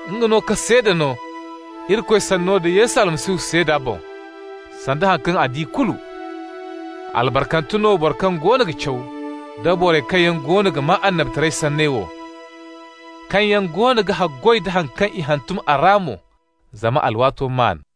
Nga no ka seeda no Irikoy sanno nda Yesu Almasihu seeda boŋ, sanda haŋ kaŋ a di kulu. Albarkante no boro kaŋ goono ga caw, da borey kaŋ yaŋ goono ga maa annabitaray sanney wo, kaŋ yaŋ goono ga haggoy da haŋ kaŋ i hantum a ra mo, zama alwaato maan.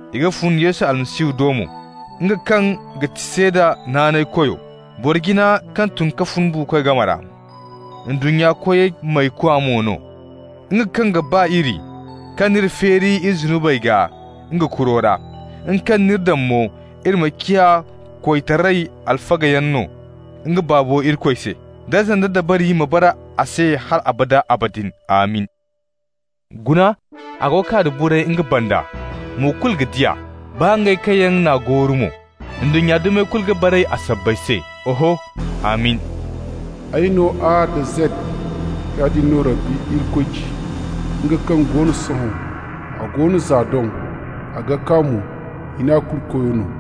I ga fun Yesu Almasihu do mo, nga kaŋ ga ti seeda naanaykoy, boro jina kaŋ tun ka fun buukoy game ra, ndunnya koyey maykwa mo no. Nga kaŋ ga ba iri, kaŋ n'iri feeri iri zunubey gaa nga kuro ra, kaŋ n'iri daŋ mo iri ma ciya koytaray, alfagayaŋ no nga Baabo Irikoy se, darza nda dabari ma bara a se hal abada abadin. Amin! Guna, a go kaa da burey nga banda. Mo kulu ga di a, baa ngey kaŋ yaŋ n'a gooru mo. Ndunnya dumey kulu ga baray a sabbay se. Oho, Amin! Ay no A nda Zed, yaadin no Rabbi Irikoy ci, nga kaŋ go no sohõ, a go no za doŋ, a ga kaa mo, Hina-Kulu-Koyo no.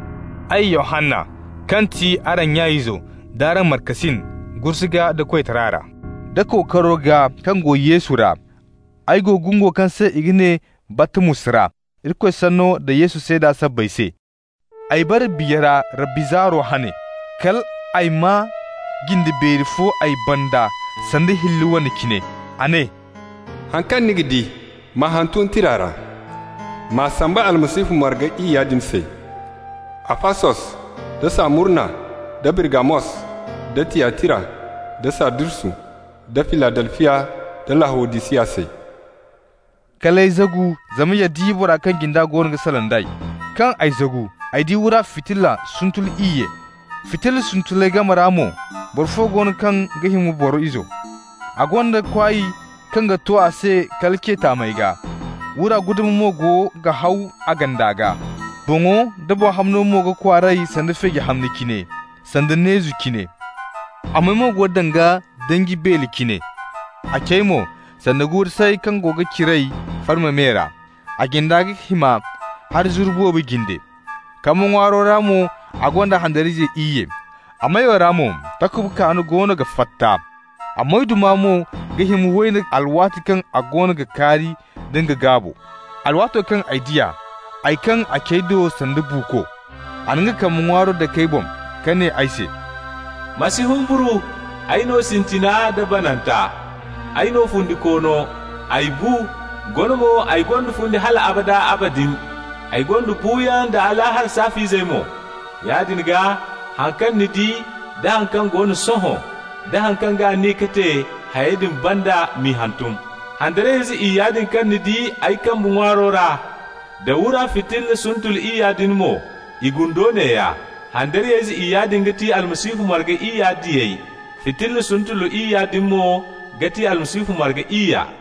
Ay, Yohanna kaŋ ti araŋ nya-izo d'araŋ markasin gurzuga da koytara ra, da kookaro gaa kaŋ go Yesu ra, ay go gungo kaŋ se i ga ne Batmus ra, Irikoy sanno da Yesu seeda sabbay se. Ay bara Biya ra Rabbi zaaro hane. Kal ay maa jinde beeri fo ay banda sanda hilli wane cine. A ne: «Haŋ kaŋ ni ga di, m'a hantum tira ra. M'a samba Almasihu marga iyya din se: Afasos, da Samurna, da Birgamos, da Tiyatira, da Sardisu, da Filadelfiya, da Lawodisiya se.» Kal ay zagu zama ya di bora kaŋ jinda goono ga salaŋ d'ay. Kaŋ ay zagu, ay di wura fitilla suntulu iyye. Fitilla suntuley game ra mo, boro fo go no kaŋ ga hima Boro Izo. A gonda kwaay kaŋ ga to a se kala ce taamey gaa, wura guddama mo go ga haw a ganda gaa. Boŋo d'a boŋ hamno mo ga kwaaray sanda feeji hamni cine, sanda neezu cine, a moy mo go danga danji beele cine. A cey mo, sanda guuru-say kaŋ go ga ciray farme me ra. A jinda ga hima hari zuru boobo jinde. Kambe ŋwaaro ra mo a gonda handariyayze iyye. A meyo ra mo takuba kaano goono ga fatta. A moyduma mo ga hima wayna alwaati kaŋ a goono ga kaari da nga gaabo. Alwaato kaŋ ay di a, ay kaŋ a cey do sanda buuko. A na nga kambe ŋwaaro dak'ay boŋ ka ne ay se: «Ma si humburu! Ay no Sintina nda Bananta. Ay no Fundikoono. Ay bu, guna mo ay gonda fundi hal abada abadin. Ay gonda buuyaŋ da Alaahara saaf'izey mo. Yaadin gaa, haŋ kaŋ ni di, da haŋ kaŋ go no sohõ, da haŋ kaŋ ga aniya ka te hayey din banda, m'i hantum. Handariyayze iyya din kaŋ ni di ay kambe ŋwaaro ra, da wura fitilla suntulu iyya din mo, i gundo neeya: Handariyayze iyya din ga ti Almasihu marga iyya diyey, fitilla suntulu iyya din mo ga ti Almasihu marga iyya.»